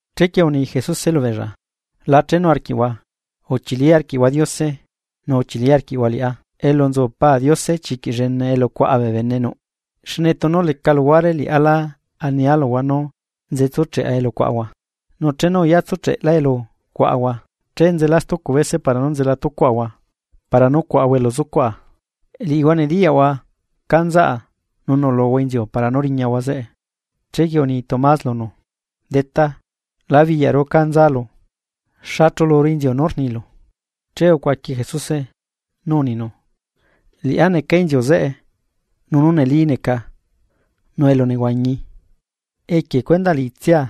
’Chequie uni Jesuse lubeella: ―La chenu arquiꞌhua, uchili arquiꞌhua Diose, nu uchili arquiꞌhua liꞌá. Elu nzucu Pa Diose chiquiꞌ nuꞌ luguare elu cuaꞌa bee bene nuꞌ, xne tunu leca luhuare liꞌá lá ania luhua nú nze tsucheꞌa elu cuaꞌahua. Nu chenu uyatsucheꞌla elu cuaꞌahua, che nzela stucu bese para nú nzela tucuaꞌahua para nú cuaꞌahua elu zucuaꞌa. Liꞌihua nediyaꞌhua cá nzaꞌa nu nuꞌluhua inziu para nú riñahua zeꞌe. Chequie uni Tomás lunu: ―Detá, la biyaꞌru cá nzalu, ¿xa chuluru inziu nú rnilu? Che ucuaqui Jesuse, nú uninu: ―Liꞌá neca inziu zeꞌe, nu nú neli neca, nu elu nehuañi. Equie cuendaꞌ liꞌitsia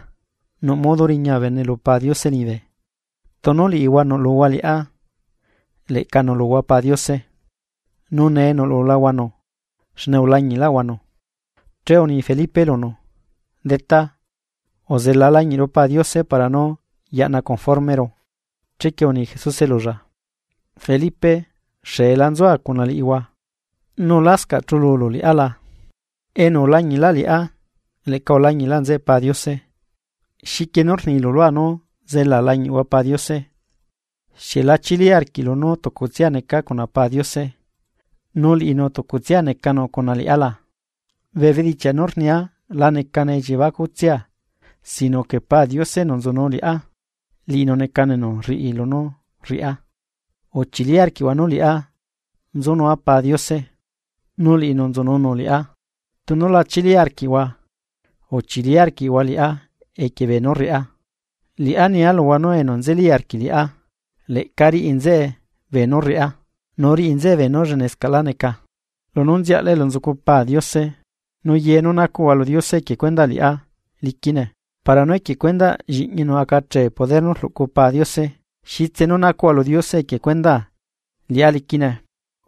nuꞌ modo riña bee bene lu Pa Diose liñibe. Tunu liꞌihua nuꞌluhua liꞌá leꞌca nuꞌluhua Pa Diose nu nee nuꞌlulahuanu, xne ulañiꞌlaꞌhuanu. Che uni Felipe lunu: ―Detá, uzela lañiꞌru Pa Diose para nú yaꞌna conformero. Chequie uni Jesuse lulla: ―Felipe, xeela nzua cuna liꞌihua, ¿Nu lascaꞌ chululu liꞌá la? Enu ulañiꞌlaꞌ liꞌá, leꞌca ulañiꞌlaꞌ nzeꞌe Pa Diose, ¿xiquie nú rnilu lua nú zelaa lañiꞌhua Pa Diose? ¿Xieꞌ la chili arquiꞌlu nú tucutsia neca cuna Pa Diose nu liꞌinu tucutsia necanu cuna liꞌá la? Bee bedichiaꞌ nú rnia la necane elliebacutsia sino que Pa Diose, enu nzunu liꞌá, liꞌinu necanu enu rriꞌi lunú rriꞌá. Uchili arquiꞌhua nú liꞌá nzunua Pa Diose, nu liꞌinu nzununu liꞌá, tunu la chili arquiꞌhua, uchili arquiꞌhua liꞌá equie beenú rriꞌá. Liꞌá nia luhua nú enu nzeli arquiꞌ liꞌá, leꞌca riꞌi nzeꞌe beenú rriꞌá, nu riꞌi nzeꞌe beenú llenescaꞌlá neca, lunú nziaꞌla elu nzucu Pa Diose. Nu ye nú nacuꞌhua lu Diose equie cuendaa liꞌá liquine. Para nú equie cuendaꞌ lliꞌñinu acachee poder nú rluꞌcu Pa Diose. Xitse nú nacuꞌhua lu Diose equie cuendaa, liꞌá liquine.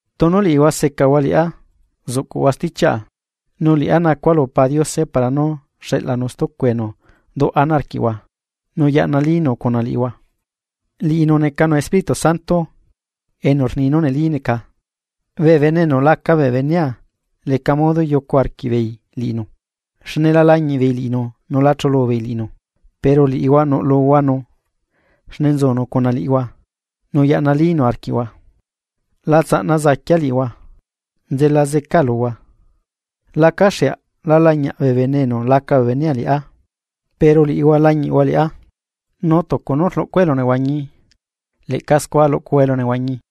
’Tunu liꞌihua secahua liꞌá, zuꞌcuhua stichiaꞌa. Nu liꞌá nacua lu Pa Diose para nú xeꞌlanu stucu enu duꞌ ana arquiꞌhua nu yaꞌnalínu cuna liꞌihua. Liꞌinu necanu Espíritu Santo enu rni nú neli neca, bee bene enu laca bee benea leca modo yucu arquiꞌbeei liꞌinu. Xne la lañiꞌ beei liꞌinu nu la chulu beei liꞌinu. Pero liꞌihua nuꞌluhuanu xne nzunu cuna liꞌihua nu yaꞌnalínu arquiꞌhua. La tsaꞌna zaquia liꞌihua, nzela zeca luhua. Lacaxeaꞌ la lañiaꞌ bee bene enu laca bee benea liꞌá, pero liꞌihua lañiꞌhua liꞌá. Nu tucunú rluꞌcua elunehuañi, leꞌca scua luꞌcuhua elunehuañi.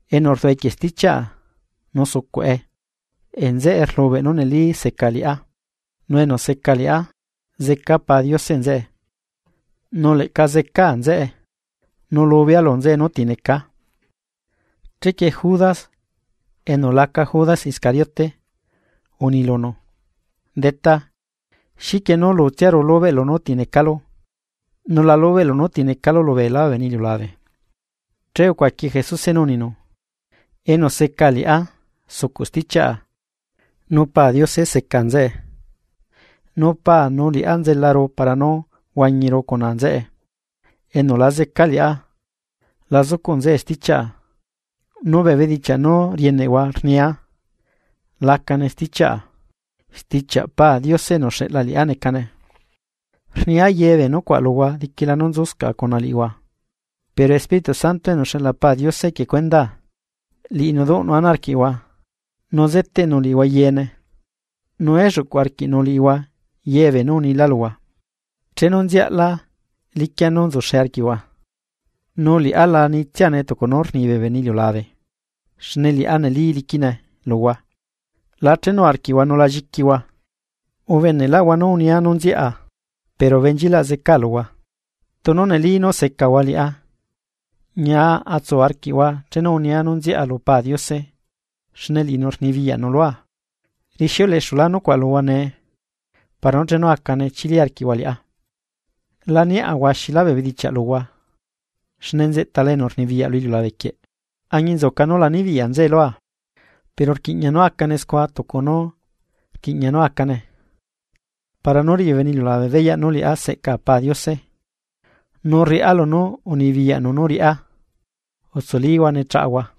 Enu rduꞌ equie stichiaꞌa nu sucuꞌe, nzeꞌe rlubeꞌ nú neli seca liꞌá. Nu enu seca liꞌá zeca Pa Diose nzeꞌe, nu leꞌca zecaa nzeꞌe, nu lubea lu nzeꞌe nú ti necaa. Chequie Judas (enu laca Judas Iscariote) uni lunu: ―Detá, ¿xiquie nú lutsiaru lubeꞌlu nú ti necalu? Nu la lubeꞌlu nú ti necalu lu beelá bee bene iliulabe. Che ucuaqui Jesuse nú uninu: ―Enu seca liꞌá sucuꞌ stichiaꞌa, nu Paa Diose seca nzeꞌe, nu Paa nu liꞌá nzelaru para nú huañiru cuna nzeꞌe. Enu la zeca liꞌá, la zucuꞌ nzeꞌe stichiaꞌa nu bee bedichiaꞌ nú rieneꞌhua rnia lacane stichiaꞌa, stichiaꞌ Paa Diose enu uxeꞌla liꞌá necane. ’Rnia ye bee nucuaꞌ luhua diquila nú nzuscaꞌa cuna liꞌihua; pero Espíritu Santo enu xeꞌla Paa Diose equie cuendaa, liꞌinu duꞌnu ana arquiꞌhua nu zeteꞌnu liꞌihua yeene, nu elluꞌcu arquiꞌnu liꞌihua ye beenú unila luhua. Chenu nziaꞌla liquia nú nzuxe arquiꞌhua, nu liꞌá la nitsiane tucu nú rni bee bene iliulabe xne liꞌá neli liquine luhua. La chenu arquiꞌhua nu la lliquihua. ’Ubeneꞌlaꞌhua nú unia nú nziaꞌa pero benchilaꞌ zecaa luhua. Tunu neli nú secahua liꞌá, ñia atsu arquiꞌhua chenu unia nú nziaꞌa lu Pa Diose, xne liꞌinu rnibiyaꞌnu lua. Rixiuleꞌexula nucuaꞌ luhua nee para nú chenu acane chili arquiꞌhua liꞌá. ’La niaꞌa huaxilá bee bedichiaꞌ luhua, xne nzeꞌtala enu rnibiyaꞌ lu iliulabe quieꞌ. Añinzuca nú la nibiyaꞌ nzeꞌe lua, pero rquiꞌña nú acane scua tucu nú rquiꞌña nú acane, para nú riꞌi bee bene iliulabe beyaꞌ nú liꞌá seꞌca Pa Diose, nu rriꞌá lunú unibiyaꞌnu riꞌá. Utsulihua ne chaꞌahua.